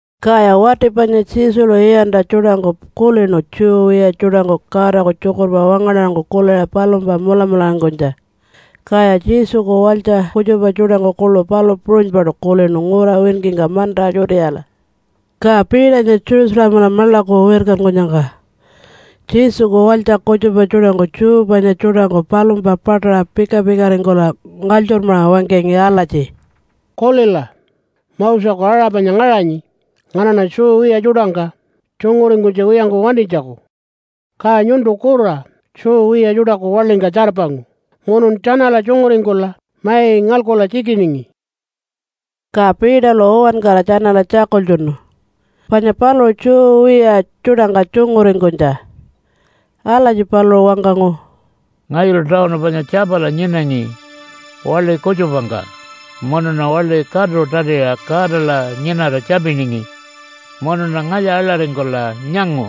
Kaya wati panya Jesulu iyantja tjuṯangku kulinu Jew wiya tjuṯangku Godaku tjukurpa wangaṉarangku kuliṟa palumpa mulamularingkunytja. Kaya Jesuku walytja kutjupa tjuṯangku kuḻu palu puṟunypaṯu kulinu ngura winkingka manta Judeala. Ka Peternya Jerusalemala maḻaku wirkankunyangka Jesuku walytja kutjupa tjuṯangku Jew panya tjuṯangku palumpa paṯaṟa pika-pikaringkula ngalytjurmaṟa wangkangi alatji, “Kulila! Moseku aṟa panya ngaṟanyi nganaṉa Jew wiya tjuṯangka tjunguringkunytja wiyangku wantinytjaku. Ka nyuntu kura Jew wiya tjuṯaku waḻingka tjarpangu munun tjanala tjunguringkula mai ngalkula tjikiningi.” Ka Peterlu uwankara tjanala tjakultjunu panya paluṟu Jew wiya tjuṯangka tjunguringkunytja. Alatji paluṟu wangkangu, “Ngayulu tawunu panya Tjapala nyinangi waḻi kutjupangka munuṉa waḻi katu tatiṟa Godala nyinara tjapiningi munuṉa ngalya aḻaringkula nyangu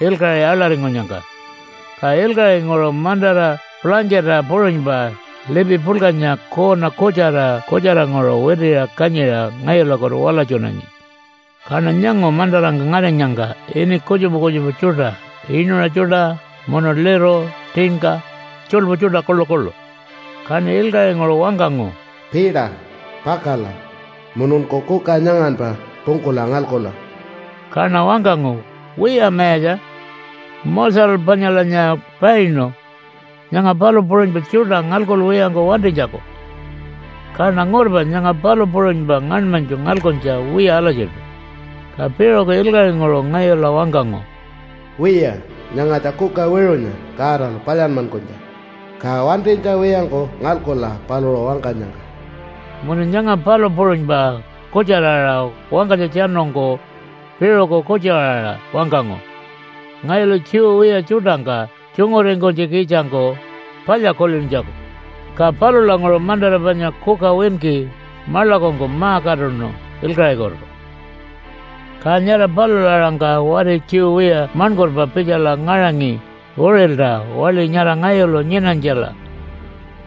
ilkaṟi aḻaringkunyangka. Ka ilkaṟinguṟu mantara pulangkita puṟunypa lipi puḻkanya kuuna kutjara kutjaranguṟu witiṟa kanyiṟa ngayulakutu walatjunangi. Kaṉa nyangu mantarangka ngarinyangka ini kutjupa kutjupa tjuṯa inuṟa tjuṯa munu liru, tinka, tjuḻpu tjuṯa kuḻukuḻu. Kaṉi ilkaṟinguṟu wangkangu, ‘Peter! Pakala mununku kuka nyanganpa pungkula ngalkula!’ Kaṉa wangkangu, ‘Wiya Mayatja! Moselu panyalanya painu nyanga palu puṟunypa tjuṯa ngalkuwiyangku wantinytjaku. Kaṉa ngurpa nyanga palu puṟunypa ngaṉmanytju ngalkuntja wiya alatjiṯu.’ Ka piṟuku ilkaṟinguṟu ngayula wangkangu, ‘Wiya nyangatja kuka wiṟunya Godalu palyanmankunytja, ka wantinytja wiyangku ngalkula paluṟu wangkanyangka.’ Munu nyanga palu puṟunypa kutjara-aṟa wangkanytjatjanungku piṟuku kutju-aṟa wangkangu, ngayulu Jew wiya tjuṯangka tjunguringkunytjikitjangku palya kulintjaku. Ka palulanguṟu mantara panya kuka winki maḻakungku ma-katuṉu ilkaṟikutu. “Ka nyara palula aṟangka wati Jew wiya maṉkurpa pitjala ngaṟangi uṟilta waḻi nyara ngayulu nyinanytjala,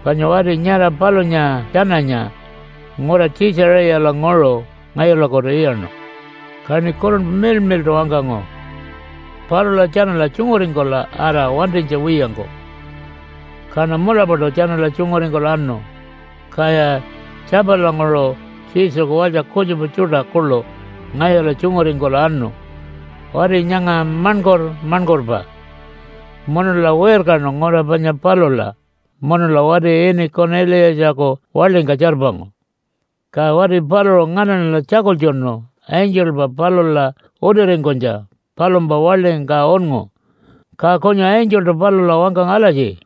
panya wati nyara palunya tjananya ngura Tjiitjaṟiyalanguṟu ngayulakutu iyaṉu. Kaṉi Kurunpa Miḻmiḻṯu wangkangu, ‘Palula tjanala tjunguringkula ara wantinytja wiyangku!’ Kaṉa mulapaṯu tjanala tjunguringkula anu. Kaya Tjapalanguṟu Jesuku walytja kutjupa tjuṯa kuḻu ngayula tjunguringkula anu wati nyanga maṉkur-maṉkurpa. Munula wirkanu ngura panya palula munula wati ini Kuniliyatjaku waḻingka tjarpangu. Ka wati paluṟu nganaṉala tjakultjunu angelpa palula utiringkunytja palumpa waḻingka unngu. Ka kunyu angeltu palula wangkangu alatji,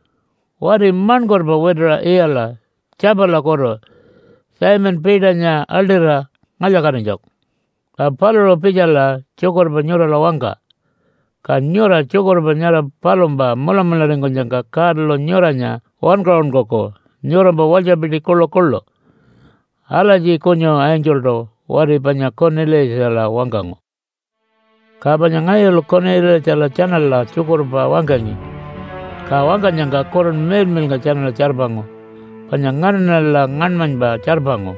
‘Wati maṉkurpa wituṟa iyala Tjapalakutu Simon Peternya aḻṯira ngalya-katinytjaku. Ka paluṟu pitjala tjukurpa nyurala wangka. Ka nyura tjukurpa nyara palumpa mulamularingkunyangka Godalu nyuranya wankaṟunkuku nyurampa walytjapiti kuḻukuḻu.’ Alatji kunyu angeltu wati panya Kuniliyatjala wangkangu. “Ka panya ngayulu Kuniliyatjala tjanala tjukurpa wangkangi, ka wangkanyangka Kurunpa Miḻmiḻnga tjanala tjarpangu, panya nganaṉala ngaṉmanypa tjarpangu,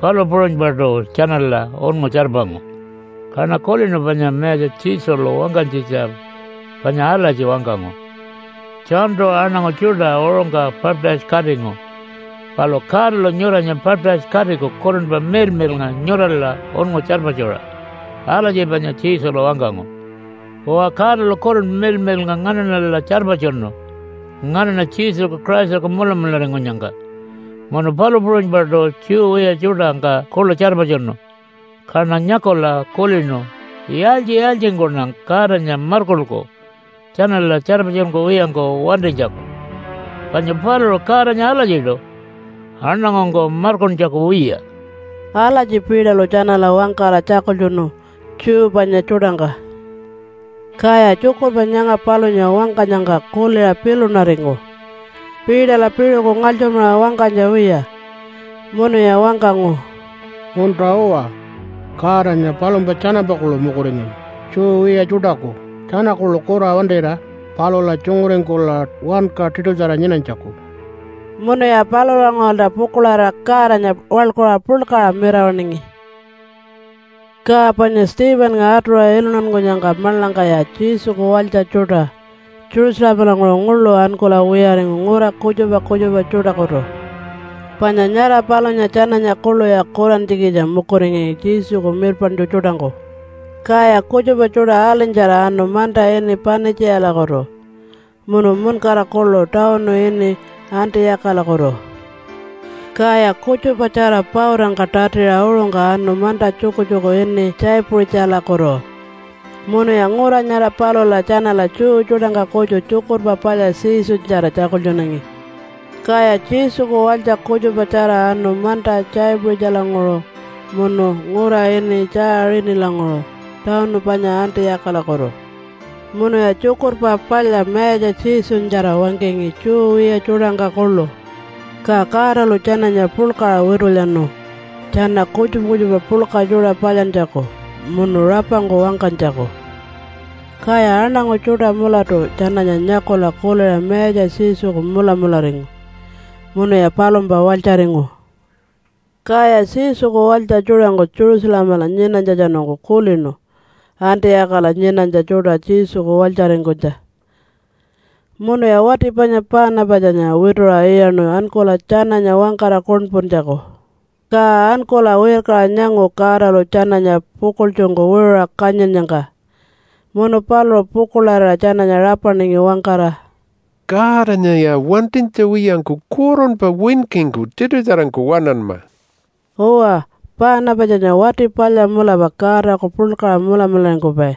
palu puṟunypaṯu tjanala unngu tjarpangu. Kaṉa kulinu panya Mayatja Jesulu wangkanytjitja panya alatji wangkangu, ‘Johntu aṉangu tjuṯa uṟungka baptise-katingu, palu Godalu nyuranya baptise-katiku Kurunpa Miḻmiḻnga nyurala unngu tjarpatjuṟa.’ Alatji panya Jesulu wangkangu. Uwa, Godalu Kurunpa Miḻmiḻnga nganaṉala tjarpatjunu nganaṉa Jesuku Christaku mulamularingkunyangka, munu palu puṟunypaṯu Jew wiya tjuṯangka kuḻu tjarpatjunu. Kaṉa nyakula kulinu, ‘Yaaltji-yaaltjingkuṉa Godanya markulku tjanala tjarpatjunkuwiyangku wantinytjaku, panya paluṟu Godanya alatjiṯu aṉangungku markuntjaku wiya.’” Alatji Peterlu tjanala wangkara tjakultjunu Jew panya tjuṯangka. Kaya tjukurpa nyanga palunya wangkanyangka kuliṟa pilunaringu Peterla piṟuku ngalytjurmaṟa wangkanytja wiya. Munuya wangkangu, “Munta-uwa! Godanya palumpa tjanampa kuḻu mukuringanyi Jew wiya tjuṯaku tjana kuḻu kura wantira palula tjunguringkula wanka tiṯutjara nyinanytjaku.” Munuya palulanguṟulta pukuḻarira Godanya waḻkuṟa puḻkaṟa mirawaṉingi. Ka panya Stephennga atuṟa iluntankunyangka maḻangkaya Jesuku walytja tjuṯa Jerusalemalanguṟu nguḻu ankula wiyaringu ngura kutjupa kutjupa tjuṯakutu, panya nyara palunya tjananya kuḻuya kurantjikitja mukuringangi Jesuku mirpaṉtju tjuṯangku. Kaya kutjupa tjuṯa alinytjara anu manta ini Panitjiyalakutu, munu muṉkara kuḻu tawunu ini Antiyakalakutu, kaya kutjupatjara pautangka tatiṟa uṟungka anu manta tjukutjuku ini Tjaipuṟitjalakutu. Munuya ngura nyara palula tjanala Jew tjuṯangka kutju Tjukurpa Palya Jesunyatjara tjakultjunangi. Kaya Jesuku walytja kutjupatjara anu manta Tjaipuṟitjalanguṟu munu ngura ini Tjaaṟinilanguṟu tawunu panya Antiyakalakutu, munuya Tjukurpa Palya Mayatja Jesunyatjara wangkangi Jew wiya tjuṯangka kuḻu. Ka Godalu tjananya puḻkaṟa witulyanu tjana kutjupa kutjupa puḻka tjuṯa palyantjaku munu rapangku wangkanytjaku, kaya aṉangu tjuṯa mulatu tjananya nyakula kuliṟa Mayatja Jesuku mulamularingu munuya palumpa walytjaringu. Kaya Jesuku walytja tjuṯangku Jerusalemala nyinanytjatjanungku kulinu Antiyakala nyinanytja tjuṯa Jesuku walytjaringkunytja, munuya wati panya Paanapatjanya wituṟa iyaṉu ankula tjananya wangkara kuṉpuntjaku. Ka ankula wirkaṟa nyangu Godalu tjananya pukuḻtjungku wiṟuṟa kanyinnyangka. Munu paluṟu pukuḻarira tjananya rapaningi wangkara, “Godanyaya wantinytja wiyangku kurunpa winkingku tiṯutjarangku waṉanma.” Uwa, Paanapatjanya wati palya mulapa Godaku puḻkaṟa mulamularingkupai,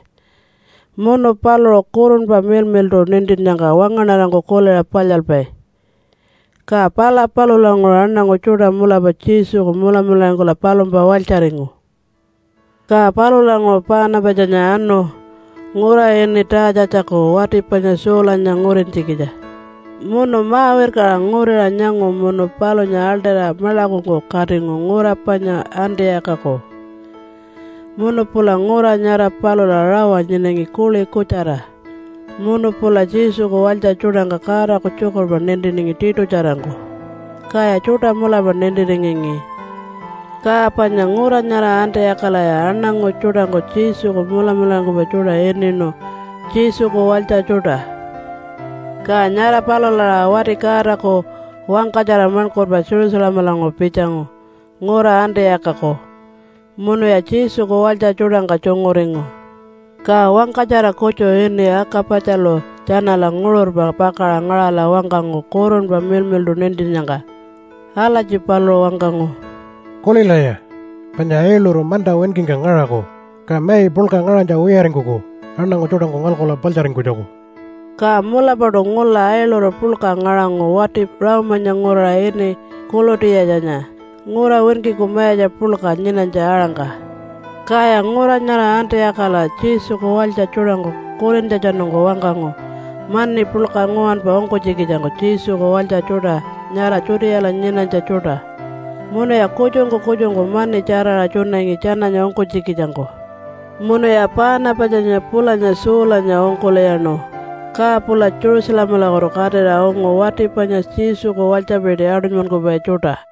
munu paluṟu Kurunpa Miḻmiḻṯu nintinnyangka wangaṉarangku kuliṟa palyalpai. Ka pala palulanguṟu aṉangu tjuṯa mulapa Jesuku mulamularingkula palumpa walytjaringu. Ka palulanguṟu Paanapatjanya anu ngura ini Taatjatjaku wati panya Saulanya ngurintjikitja. Munu ma-wirkaṟa nguriṟa nyangu munu palunya aḻṯira maḻakungku katingu ngura panya Antiyakaku. Munu pula ngura nyara palula rawa nyinangi kuḻi kutjara munu pula Jesuku walytja tjuṯangka Godaku tjukurpa nintiningi tiṯutjarangku, kaya tjuṯa mulapa nintiringangi. Ka panya ngura nyara Antiyakalaya aṉangu tjuṯangku Jesuku mulamularingkupai tjuṯa ininu Jesuku walytja tjuṯa. Ka nyara palula aṟa wati Godaku wangkatjara maṉkurpa Jerusalemalanguṟu pitjangu ngura Antiyakaku munuya Jesuku walytja tjuṯangka tjunguringu. Ka wangkatjara kutju ini Aka-patjalu tjanala nguṟurpa pakaṟa ngaṟala wangkangu Kurunpa Miḻmiḻṯu nintinnyangka. Alatji paluṟu wangkangu, “Kulilaya! Panya ailuru manta winkingka ngaṟaku, ka mai puḻka ngaṟanytja wiyaringkuku aṉangu tjuṯangku ngalkula paḻtjaringkunytjaku.” (Ka mulapaṯu ngula ailuru puḻka ngaṟangu wati Rome-anya nguraṟa ini Kuḻutiyatjanya ngura winkiku mayatja puḻka nyinanytja aṟangka.) Kaya ngura nyara Antiyakala Jesuku walytja tjuṯangku kulintjatjanungku wangkangu mani puḻka nguwanpa ungkunytjikitjangku Jesuku walytja tjuṯa nyara Judeala nyinanytja tjuṯa. Munuya kutjungku kutjungku mani tjaraṟa tjunangi tjananya ungkunytjikitjangku. Munuya Paanapatjanya pulanya Saulanya ungkul'iyaṉu, ka pula Jerusalemalakutu katira ungu wati panya Jesuku walytjapiti aṯunymankupai tjuṯa.